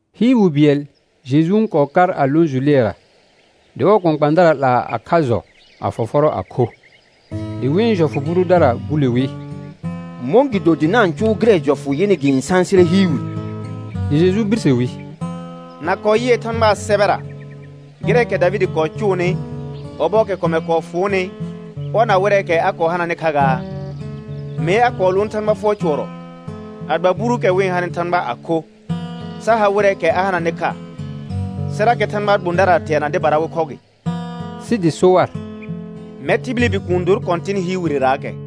Hɩɩr wi bɩɛl Jeju n kɔɔ kar a lõ jʋ lɩɛra. Dɩ ɔɔ kpãkpãadara 'laa a kha jɔ a fɔfɔrɔ a kho. Dɩ wɩ̃ jɔfʋ bʋ dʋdara bule wi: Mɔ̃gɩdo dɩ na-n cʋʋ gɩrɛ jɔfʋ yɩnɩ gɩ-n sãsɩrɛ hɩɩr wire? Dɩ Jeju birse wi: Na kɔɔ yɩɛ Thãgbaa sɛbɛra gɩrɛɛkɛ Davɩdɩ kɔɔ cʋʋnɩ, ɔbɔɔkɛ kɔmɛr kɔɔ fʋʋnɩ ɔr na wɩrɛɛkɛ a kɔɔ hananɩ kha gaa? Mee a kɔɔ lʋʋn Thãgba fʋɔr cʋɔrɔ a gba buruukɛ wɩ-n hanɩ Thãgba a kho, sa ha wɩrɛɛkɛ a hananɩ kha, sɩrakɛ Thãgbaa gbõdara teana dɩbara wɩ khɔ gɩ. Sɩ dɩ so war: Mɛr tibili Bikuun dor Kɔ̃tɩn hɩɩr wirerarakɛ.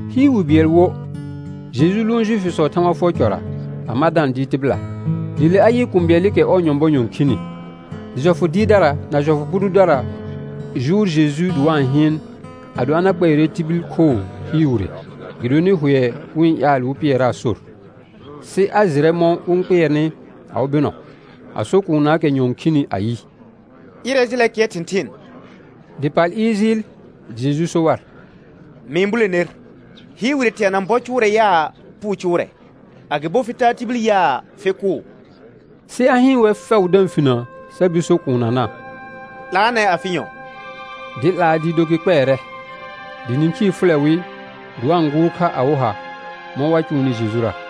Hɩɩr wi bɩɛl wo, Jeju lʋʋn Juifisɔɔ Thãgba fʋɔr cɔra, a ma da-n dɩɩr tɩbɩla. Dɩ le a yɩ kũu bɩɛlɩkɛ ɔɔ nyɔ̃bɔ nyɔ̃ khini. Dɩ jɔfʋ dɩɩrdara na jɔfʋ bʋ dʋdara jʋʋr Jeju dɩ wa-n hɩɩn ado a na kpɛɛrɛ tibil khoo hɩɩr wire, gɩdonɩ hʋɛ wɩ-n ƴaal wɩ pɩɛraa sor. Sɩ a jɩrɛ mɔ̃ wɩ-n kpɩɛrnɩ awɩ bɩnɔ, a so kuunnaakɛ nyɔ̃ɔ khini ayɩ: Ɩrɛ jɩlɛ kɩɛr thɩ̃thɩɩn. Dɩ pal ɩɩr jɩɩl. Dɩ Jeju so war: Mɩ-n bule ner, hɩɩr wire teana bɔ cʋʋrɛ yaa, puu cʋʋrɛ; agɩbo fɩ taa tibil yaa, fɩ kʋʋ? Sɩ a hɩɩn wɛr fɛʋ da-n finə sa bir so kuunnana: 'Laanɛ afɩ nyɔ̃; dɩ 'laa dɩɩ do gɩ kpɛɛrɛ. Dɩ nĩkhii fʋlɛ wɩ, dɩ wa-n gʋʋr kha awɩ ha mɔ̃ wa cʋʋnɩ Jejura.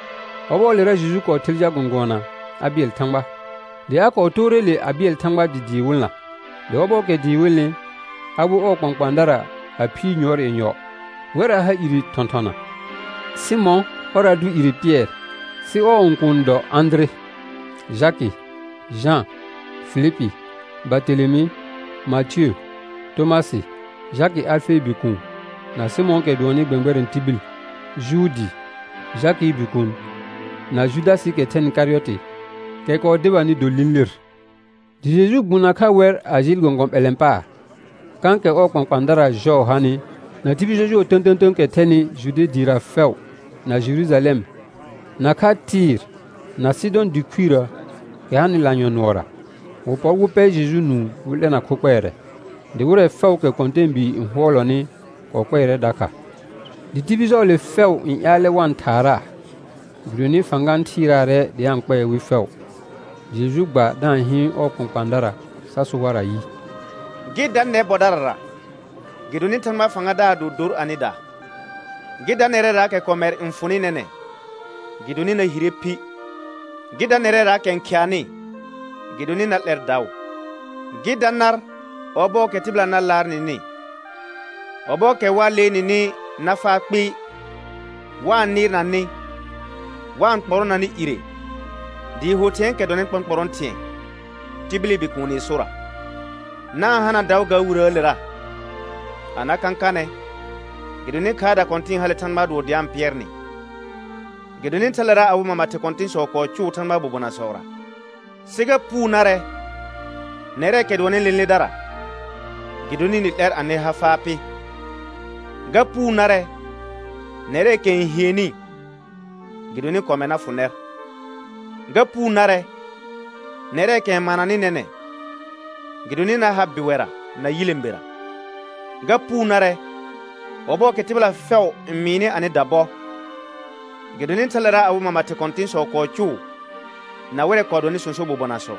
Ɔbɔɔlera Jeju kɔɔ ther jal gɔ̃gʋɔna a bɩɛl Thãgba; dɩ a kɔɔ toore le a bɩɛl Thãgba dɩ dɩɩ wɩlna. Dɩ ɔbɔɔkɛ dɩɩ wɩlnɩ, a wer ɔɔ kpãkpãadara a phiir yʋɔr yenyɔ. Wɛr a ha ire thɔ̃thɔna: Sɩmɔ̃ ɔr a dʋ ire Pɩɛr, sɩ ɔɔ õkuun n dɔ Ãdire, Jakɩ. Jã, Filipi, Bartelemɩ, Matiə, Tomasɩ, Jakɩ Alfee bikuun, na Sɩmɔ̃ɔkɛ dʋɔnnɩ gbɛ̃gbɛrɛ̃ tibil, Juudi Jakɩɩ bikuun, na Judasɩɩkɛ thɛnɩ Karɩyɔtɩ, kɛ kɔɔ debanɩ do lĩlir. Dɩ Jeju gbũ nakha wɛr a jɩɩl gɔ̃gɔ̃ ɓɛlɛ̃ paar, kãkɛ ɔɔ kpãkpãadara jɔɔ hanɩ, na tibil jɔjʋɔ tə̃tə̃tə̃əkɛ thɛnɩ. Jude dɩɩra fɛʋ na Jerujalɛm, nakha Tɩɩr na Sɩdɔ̃ dɩ khuirə kɛ hanɩ lanyɔ̃ nʋɔra. Wɩ pɔr wɩ pɛ Jeju nũu wɩ 'lɛna kho kpɛɛrɛ. Dɩ wɩrɛ fɛʋʋkɛ kɔ̃tɛɛbii n hʋɔlɔnɩ kɔɔ kpɛɛrɛ dakha. Dɩ tibil jɔɔle fɛʋ n ƴaalɛ wa-n thaaraa, gɩdonɩ fãga n thɩɩraarɛ dɩ a-n kpɛɛ wɩ fɛʋ. Dɩ Jeju gba da-n hɩɩn ɔɔ kpãkpãadara sa so war ayɩ: Gɩ da nɛr bɔdarara, gɩdonɩ Thãgbaa fãgadaar do dor anɩda. Gɩ da nɛrɛraakɛ kɔmɛr n fʋnɩ nɛnɛ̃, gɩdonɩ na hire phi. Gɩ da nɛrɛraakɛ n khɩanɩ, gɩdonɩ na 'lɛr daʋ. Gɩ da nar ɔbɔɔkɛ tɩbɩla na laar nɩnɩ, ɔbɔɔkɛ wa lee nɩnɩ na faa kpɩɩ, wa-n nɩɩrna nɩ, wa-n kpɔrɔna nɩ ire dɩɩ ho thɩ̃ɛɛkɛ dɔnɩ kpɔ̃kpɔrɔ̃ thɩ̃ɛ tibili Bikuuni sora. Na-n hana daʋ ga wiraalera a na kãkanɛ, gɩdonɩ khaarda kɔ̃tɩ̃ɩ hale Thãgbaa dʋɔ dɩ a-n pɩɛr nɩ. Gɩdonɩ thalera awɩ mama thɩ kɔ̃tɩ̃sɔ kɔɔ cʋʋ Thãgbaa bobonasɔra. Sɩ ga puu narɛ nɛrɛɛkɛ dʋɔnnɩ lẽledara, gɩdonɩ nɩ 'lɛr anɩ ha faa pɩ. Ga puu narɛ nɛrɛɛkɛ n hienni, gɩdonɩ kɔmɛr na fʋ nɛr. Ga puu narɛ nɛrɛɛkɛ n mananɩ nɛnɛ̃, gɩdonɩ na har bɩwɛra na yilẽbera. Ga puu narɛ ɔbɔɔkɛ tɩbɩla fɛʋ n mɩɩnɩ anɩda bɔ, gɩdonɩ thale awɩ mama thɩ kɔ̃tɩ̃sɔ kɔɔ cʋʋ na wɩrɛ kɔɔ dɔnɩ sõso bobonasɔ.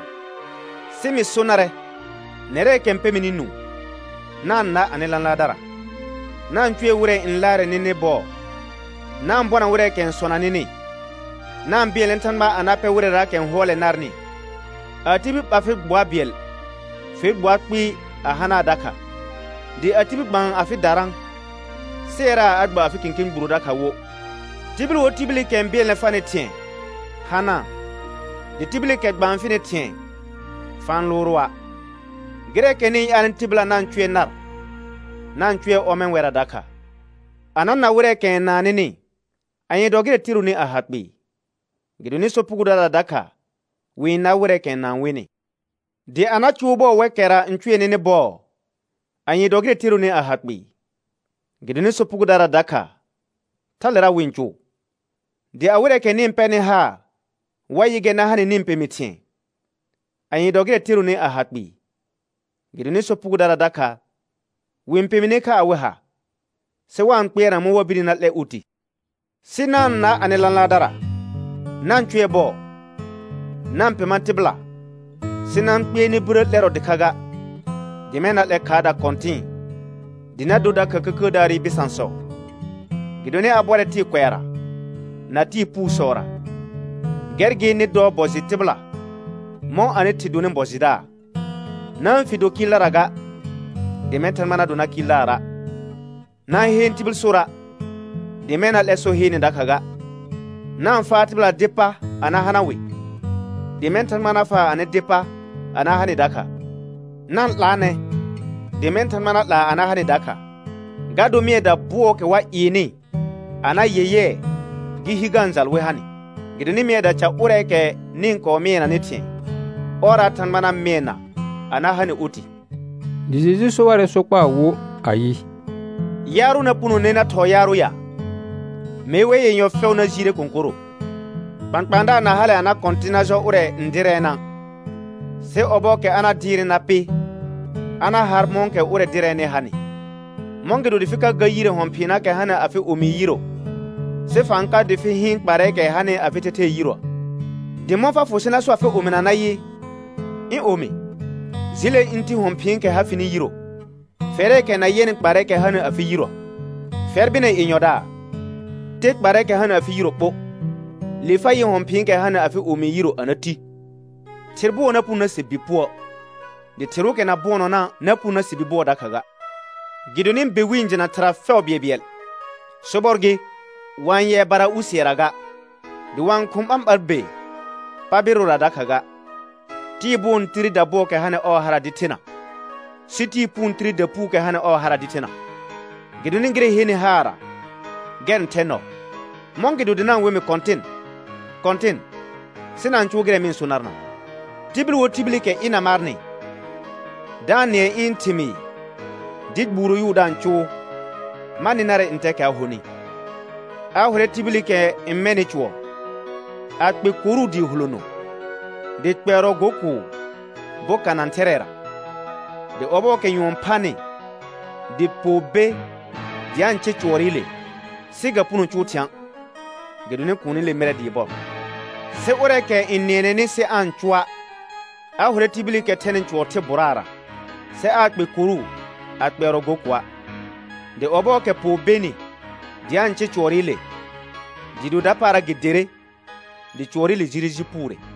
Sɩ mɩ so narɛ nɛrɛɛkɛ n pɛ mɩnɩ nũu: Na-n na anɩ lãlaardara, na-n cʋɛ wɩrɛ n laarɛ nɩnɩ bɔɔ. Na-n bɔna wɩrɛɛkɛ n sɔna nɩnɩ, na-n bɩɛlnɛ Thãgba a na pɛ wɩrɛraakɛ n hʋɔlɛ narnɩ. A tibil ɓa fɩ gbʋa bɩɛl, fe gbʋa kpɩɩ a hanaa dakha. Dɩ a tibil gbaan afɩ darã, sɩɛraa a gba afɩ kẽkẽ gburo dakha wo. Tibil wo tibilikɛ n bɩɛlnɛ farnɩ thɩ̃ɛ, hanaa, dɩ tibilikɛ gbaan fɩnɩ thɩ̃ɛ, fa-n lʋʋra'. Gɩrɛɛkɛ nɩ-n ƴaalnɩ tɩbɩla na-n cʋɛ nar, na-n cʋɛ ɔmɛ̃ wɛrra dakha. A na na wɩrɛɛkɛ n naan nɩnɩ, anye dɔ gɩrɛ teronɩ a ha kpɩɩ? Gɩdonɩ sopugodara dakha wɩ-n nar wɩrɛɛkɛ n naan wɩnɩ. Dɩ a na cʋʋ bɔɔ wɛkɛra n cʋɛ nɩnɩ bɔɔ, anye dɔ gɩrɛ teronɩ a ha kpɩɩ? Gɩdonɩ sopugodara dakha thalera wɩ-n cʋʋ. Dɩ a wɩrɛɛkɛ nɩ-n pɛrnɩ haar wa yɩ gɛr na ha nɩ nɩ-n pemi thɩ̃ɛ, anye dɔ gɩrɛ teronɩ a ha kpɩɩ? Gɩdonɩ sopugodara dakha wɩ-n pemine kha awɩ ha, sɩ wa-n kpɩɛrna mɔ̃ wa birni na 'lɛ oti. Sɩ na-n na anɩ lãlaardara, na-n cʋɛ bɔɔ, na-n pema tɩbɩla sɩ na-n kpɩɛr nɩ birə 'lɛrɔ dɩkha ga. Dɩ mɛ̃ na 'lɛ khaarda kɔ̃tɩ̃ɩ, dɩ na dor dakha Kəkəədaarɩ bɩsãsɔ, gɩdonɩ a bɔrɛ tɩɩ kʋɛara na tɩɩ puusɔra. Gɛr gɩ nɩ dɔ bɔ jɩ tɩbɩla, mɔ̃ anɩ Thɩ donɩ bɔ jɩdaar. Na-n fi do kɩɩldara ga, dɩ mɛ̃ Thãgba na do nar Kɩɩldaara'. Na-n heen tibil sora', dɩ mɛ̃ na 'lɛ so heene dakha ga. Na-n faa tɩbɩlaa dɩ pa a na hana wɩ, dɩ mɛ̃ Thãgba na faa anɩ dɩ pa a na ha nɩ dakha. Na-n 'laanɛ, dɩ mɛ̃ Thãgba na 'laa a na ha nɩ dakha. Ga dor mɩɛda bʋɔɔkɛ wa ɩɩnɩ a na yɛyɛɛ gɩ hi ga-n jal wɩ ha nɩ. Gɩdonɩ mɩɛda ca ʋrɛɛkɛ nɩ-n kɔɔ mɩɛnanɩ thɩ̃ɛ, ɔrra Thãgba na mɩɛna a na ha nɩ oti. Dɩ Jeju so warɛ sokpaa wo ayɩ: Yaarʋ na punone na thɔɔ yaarʋ ya? Mee wɛr yenyɔ fɛʋ na jiire kõkorro. Kpãkpãadaar na hale a na kɔ̃tɩ̃ na jɔ ʋrɛ n dɩrɛɛna', sɩ ɔbɔɔkɛ a na dɩɩrnɩ na pɩ, a na har mɔ̃kɛ ʋrɛ dɩrɛɛnɩ hanɩ. Mɔ̃gɩdo dɩ fɩ ka gar yire hɔ̃ phɩɩnaakɛ hanɩ afɩ omii yiro, sɩ fa-n ka dɩ fɩ hɩɩn kparrɛɛkɛ hanɩ afɩ thɛthɛɛ yiroə? Dɩ mɔ̃ fa fʋ sɩ na so afɩ omina nayɩ: Ɩ̃ omi, jɩlɛ ɩ̃ ti hɔ̃ phɩ̃ɩkɛ ha fɩnɩ yiro, fɛrɛɛkɛ na yɛnɩ kparrɛɛkɛ hanɩ afɩ yiroə? Fɛr bɩnɛ yenyɔdaar, te kparrɛɛkɛ hanɩ afɩ yiro ɓo, le fa jɩɩ yɩ hɔ̃ phɩ̃ɩkɛ hanɩ afɩ omii yiro a na ti. Thɩr bʋɔ na puno na se bi puə'. Dɩ thɩrʋʋkɛ na bʋɔnɔna' na puno na se bi bʋɔ dakha ga. Gɩdonɩ be wɩ-n jɩna thɩra fɛʋ bɩɛlbɩɛl. Sobɔr gɩ, wa-n yɛɛ bara usɩɛra ga, dɩ wa-n khʋ̃ ɓãɓar be paabɩrʋra dakha ga. Tɩɩ bʋɔ n tire dabʋɔɔkɛ hanɩ ɔɔ hara dɩ thena, sɩ tɩɩ puu n tire dapuukɛ hanɩ ɔɔ hara dɩ thena. Gɩdonɩ gɩrɛ n henɩ haarra, gɛr n thɛ nɔɔ. Mɔ̃gɩdo dɩ na-n we mɩ Kɔ̃tɩn, Kɔ̃tɩn, sɩ na-n cʋʋ gɩrɛ mɩ-n so narna'. Tibil wo tibilikɛ ɩna marnɩ da-n nɩɛ ɩ̃ thɩmɩɩ dɩ gbuuro yʋʋ da-n cʋʋ, ma nɩ narɛ ntɛɛkɛ a honɩ. A hʋrɛ tibilikɛ n mɛnɩ cʋɔr, a kpe koru dɩɩ hulono dɩ kpɛɛrɔ go kʋʋ boka nã thɛrɛɛra. Dɩ ɔbɔɔkɛ nyʋɔn phanɩ, dɩ poo be dɩ a-n cɩr cʋɔrɩle, sɩ ga puno cʋʋ thɩ̃a', gɩdonɩ kuunile mɩɩrɛ dɩɩ bɔr. Sɩ ʋrɛɛkɛ n nɩɛnɛnɩ sɩ aa-n cʋa', a hʋrɛ tibilikɛ thɛnɩ cʋɔr thɩ bʋraara, sɩ aa kpe koru a kpɛɛrɔ go kʋa'. Dɩ ɔbɔɔkɛ poo benɩ dɩ a-n cɩr cʋɔrɩle, dɩɩ do dapaara gɩ derre, dɩ cʋɔrɩle jire ji puure.